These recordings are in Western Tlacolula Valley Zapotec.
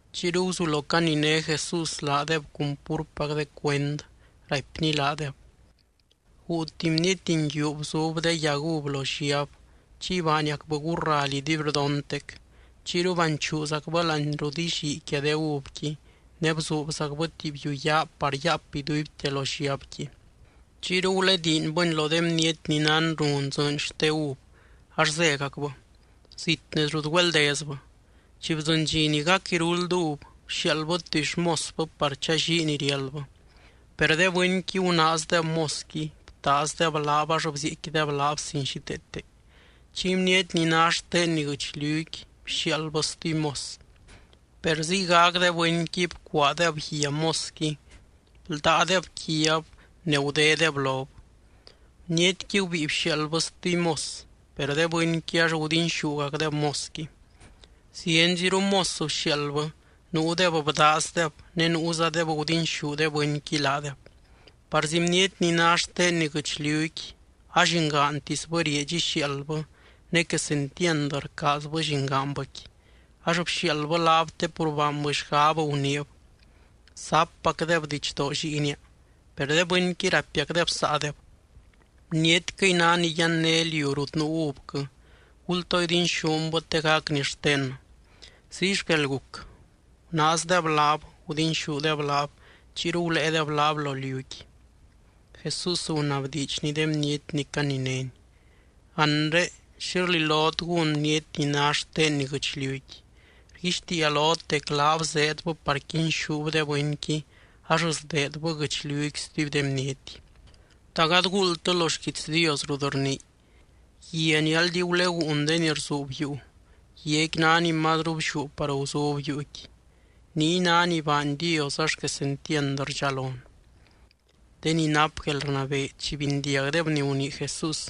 Chiyru guzulo caniné Jesús laadeb cun púrpac de cuend, raipny laadeb: —Guu tuby bniety nguiu bzub de yag uv lo lliab, chiy baaniacbɨ gurraly iduibrdontec. Chiyru banchuuzacbɨ láani rut illii quia de uvqui, ne bzuubzacbɨ tuby yuu yaa par yaap iduibte lo lliabqui. ’Chiyru gulediinbɨni lo de bniety ni nán run dzɨɨny xte uv ax zégacbɨ, zit nez rut güeldezbɨ. Chi bdzɨny dxi ni gac iruld uv, bxiaaldbɨ tuby xmosbɨ par challii ni riáldbɨ. Per de bɨnqui gunaazdeb mosqui, btaazdeb laab ax bzieecquideb laab sin xíteete. Chiy bniety ni ná xtenni guɨchliuqui bxiaaldbɨ stuby mos. Per ziygac de bɨnqui bcuaadeb guia mosqui, bldáadeb quiab ne gudédeb lob. Bnietqui gubíi bxiaaldbɨ stuby mos. Per de bɨnqui ax gudinxúgacdeb mosqui. Zienziru mos bxiaaldbɨ, nuudeb bdaazdeb ne nuuzadeb gudinxú de bɨnqui laadeb. ’Parzi bniety ni ná xtenni guɨchliuqui, allingaantisbɨ rieedx ixiaaldbɨ ne quesentiand rcaazbɨ llingaanbɨqui. Ax bxiaaldbɨ laab te pur baanbɨ xgab, guniib: “Zappacdeb didxdoo lliinia.” Per de bɨnqui raipiacdeb saadeb: “Bnietquɨy ná ni yanné liu rut nuu uvquɨ. Gultoo idinxúnbɨ te gacni xtennɨ.” Ziy xquel guc. Gunaazdeb laab, gudinxúdeb laab, chiyru guléedeb laab lo liuqui. Jesús gunabdiidxny de bniety ni caninény: —Anre, ¿xi rlilot gún bniety ni ná xtenni guɨchliuqui? Rguixtiia lot dec laab zeedbɨ par quinxúb de bɨnqui ax sdeedbɨ guɨchliuqui stuby de bniety. ’¿Ta gady guuldtɨ lo xquiits Dios rut rnii?: Guia ni aldi guleguun de ni rzuub yuu, guiaqui ná ni mazru blliú par guzub yuuqui. Niy ná ni baany Dios ax quesentiand rdxalon. De ni nap guelrnabee, chi bindiagdeb ni gunii Jesús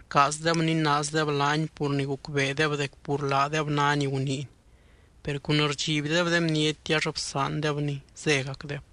rcaazdeb ninaazdeb laany pur ni gucbeedeb dec pur laadeb ná ni guniiny. Per cun rdxibdeb de bniety ax bsaandebny, zégacdeb.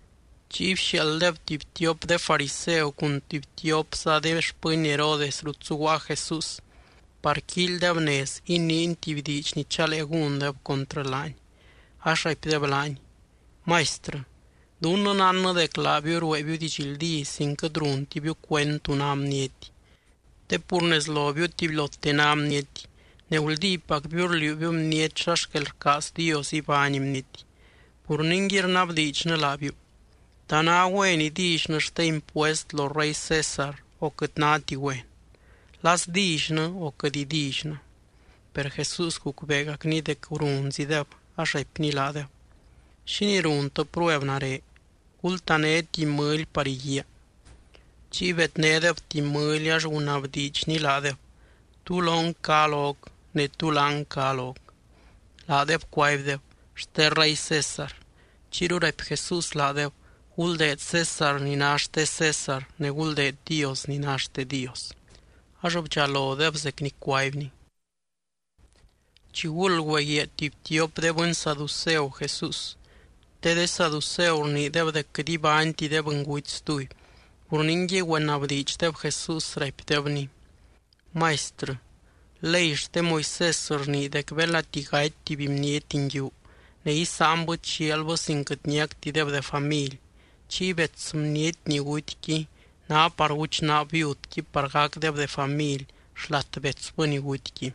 Chiy bxiaalddeb tuby tiop de fariseu cun tuby tiopza de xpɨny Herodes rut zuguaa Jesús par quíilydeb nez iniiny tuby diidx ni chalee gúndeb contrɨ laany. Ax raipdeb laany: —Maistrɨ, dunnɨ nánnɨ dec laabiu rueebiu didxldí sin quɨt runtibiu cuend tú ná bniety. Te pur nez lobiu tubylote ná bniety, ne guldípacbiu rliuubiu bniety xa xquel rcaaz Dios ibány bniety. Pur ningui, rnabdiidxnɨ laabiu: ¿Ta ná güen idillynɨ xte impuest lo rey César o quɨt náti güen? ¿La sdillynɨ o quɨt idillynɨ? Per Jesús gucbeegacny dec runzideb ax raipny laadeb: —¿Xínii runtɨ prueb nare? Gultané tuby mɨly par iguíaa. Chiy bednédeb tuby mɨly, ax gunabdiidxny laadeb: —¿Tú lon cá loc? ne, ¿tú láng cá loc? Laadeb cuaibdeb: —Xte rey César. Chiyru raipy Jesús laadeb: —Guldeed César ni ná xte César, ne guldeed Dios ni ná xte Dios. Ax bdxalodeb zec ni cuaibny. Chiguld güeguiaa tuby tiop de bɨny saduceu Jesús, te de saduceu rniideb dec quɨt ibányti de bɨnguty stuby. Pur ningui, güenabdiidxdeb Jesús, raipdebny: —Maistrɨ, ley xte Moisés rnii dec belati gaty tuby bniety nguiu ne isáanbɨ chialbɨ sin quɨt niactideb de family, chiy bets bniety ni gutyqui ná par guchnaab viudqui par gacdeb de family xlat betsbɨ ni gutyqui.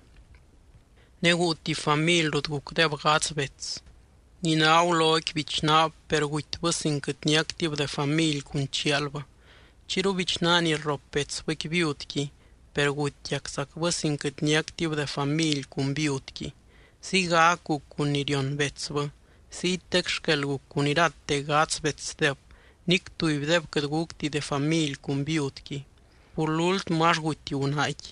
Ne guu tuby family rut gucdeb gadz bets. Ni ná guloqui bichnaab, per gutybɨ sin quɨt niactib de family cun chialbɨ. Chiyru bichnaa ni rrop betsbɨqui viudqui, per gutiaczacbɨ sin quɨt niactib de family cun viudqui. Ziygac guc cun ni rion betsbɨ. Ziytec xquel guc cun irate gadz betsdeb, nic tubydeb quɨt gucti de family cun viudqui. Pur lúltmɨ, ax guty gunaaqui.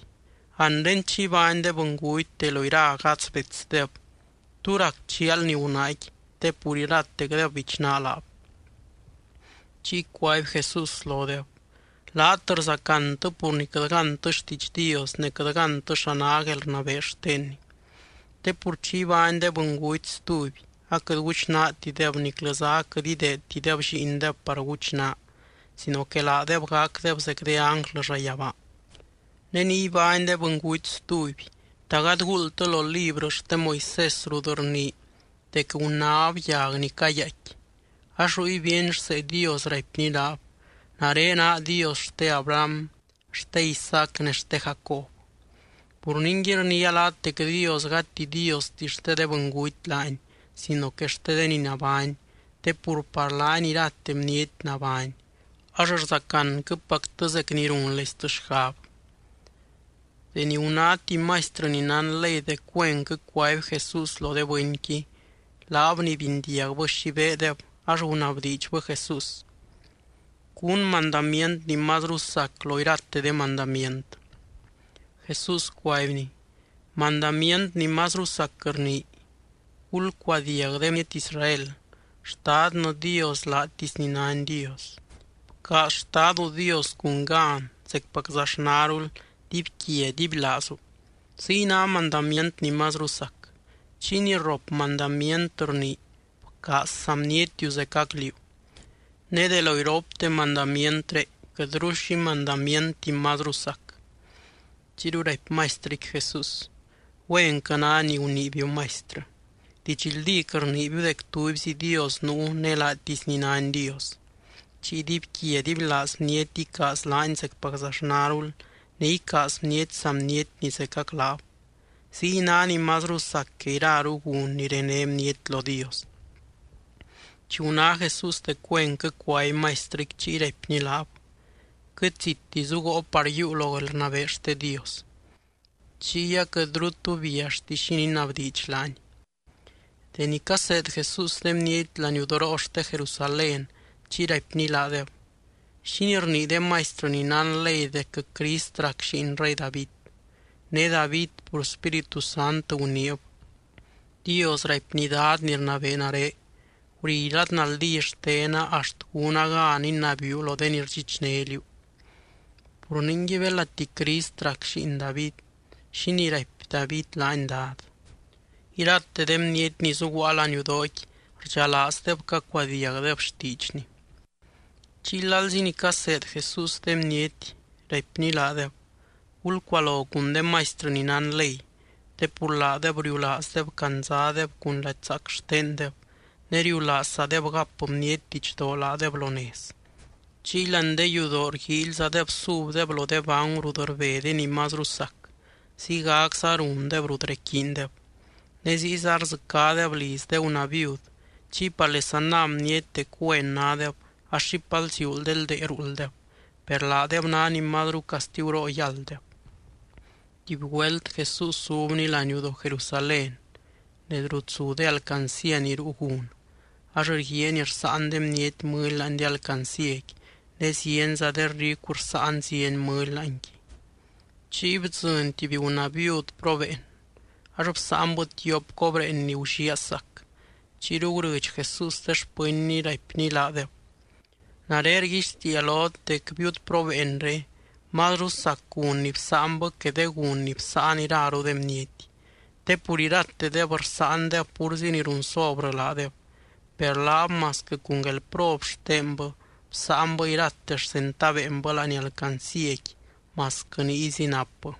Anre chi ibány de bɨnguty, de lo ira gadz betsdeb, ¿tú rac chialni gunaaqui te pur iratecdeb bichnaa laab? Chiy cuaby Jesús lodeb: —Laat rzacantɨ pur ni quɨt gántɨ xtiidx Dios ne quɨt gántɨ xa ná guelrnabee xtenny. Te pur chi ibány de bɨnguty stuby, aquɨt guchnaatideb niclɨza aquɨt ideedtideb lliindeb par guchnaa sino que laadeb gacdeb zec de ánglɨ llayabaa. Ne ni ibány de bɨnguty stuby, ¿ta gady guuldtɨ lo librɨ xte Moisés rut rnii dec gunáb yag ni cayaaicqui? Ax ruy bíeny rsee Dios, raipny laab: “Nare naa Dios xte Abraham, xte Isaac ne xte Jacob.” Pur ningui, rniia laat dec Dios gati Diosti xte de bɨnguty laany sino que xte de ni nabány, te pur par laany irate bniety nabány. Ax rzacanquɨpactɨ zec ni runleistɨ xgab. Deni guná tuby maistrɨ ni nán ley dec güenquɨ cuaby Jesús lo de bɨnqui, laab ni bindiagbɨ xi beedeb ax gunabdiidxbɨ Jesús: —¿Cún mandamient ni mazru sac lo irate de mandamient? Jesús cuaibny: —Mandamient ni mazru sac rnii: “Gulcuadiag de bniety Israel. Xtadnɨ Dios, laatisny nány Dios. Bcaaz Xtadu Dios, cun gan, zecpaczaxnarul, dibyquia dibylaazu.” Ziy ná mandamient ni mazru sac. Chiy ni rrop mandamient rnii: “Bcaaz saa bnietiu zecac liú.” Ne de lo iropte mandamientré, quɨtru xi mandamienti mazru sac. Chiyru raipy maistrɨqui Jesús: —Güenquɨ ná ni guniibiu, Maistrɨ. Didxldíc rniibiu dec tubyzi Dios nuu ne laatisny nány Dios. Chiy dibyquia dibylaaz bniety icaaz laany zecpaczaxnarul, ne icaaz bniety saa bnietni zecac laab. Ziy ná ni mazru sac que iraru gun ni rené bniety lo Dios. Chi guná Jesús dec güenquɨ cuaby maistrɨqui, chiy raipny laab: —Quɨt zitti zugoo par yiiu lo guelrnabee xte Dios. Chiy aquɨtru tu biallti xi ninabdiidx laany. Deni caseed Jesús de bniety laniudoroo xte Jerusalén chiy raipny laadeb: —¿Xínii rnii de maistrɨ ni nán ley dec Crist rac lliin rey David? Ne David pur Spíritu Sant guniib: Dios raipny Dad ni rnabee nare: “Guri lad naldí xtena axt gúna gan inabiiu lo de ni rdxichné liú.” Pur ningui, belati Crist rac lliin David, ¿xínii raipy David laany Dad? Irate de bniety ni zuguaa laniudooqui, rdxalaazdeb cacuadiagdeb xtiidxny. Chiy lalzi ni caseed Jesús de bniety, raipny laadeb: —Gulcualo cun de maistrɨ ni nán ley. Te pur laadeb riulaazdeb candzadeb cun lady zaac xtendeb, ne riulaazzadeb gap bniety didxdoo laadeb lo nez. Chiy láani de yudoo rguíilyzadeb subdeb lo de bangu rut rbe de ni mazru sac, ziygacza rundeb rut requiindeb. Ne ziyza rdzɨcádeb liz de gunaa viud, chiy parlesa ná bniety dec güen nádeb ax xipal ziuul de ldee ruulddeb. Per laadeb ná ni mazru castiguroo yálddeb. Tuby güelt, Jesús zubny laniudoo Jerusalén nez rut zu de alcancía ni ruu gun. Ax rguiaany rsáan de bniety mɨly láani de alcancíaqui ne zienza de ricu rsáan zieny mɨly láanqui. Chiy bdzɨny tuby gunaa viud probeen, ax bsáanbɨ tiop cobreen ni gulliaa sac. Chiyru gurɨdx Jesús de xpɨnny, raipny laadeb: —Nare rguixtiia lot dec viud probeenré mazru sac gun ni bsáanbɨ que de gun ni bsáan iraru de bniety. Te pur iratedeb rsáandeb púrzi ni run sobrɨ laadeb, per laab masquɨ cun guelprob xtenbɨ, bsáanbɨ irate xcentaveenbɨ láani alcancíaqui, masquɨ niyzi napbɨ.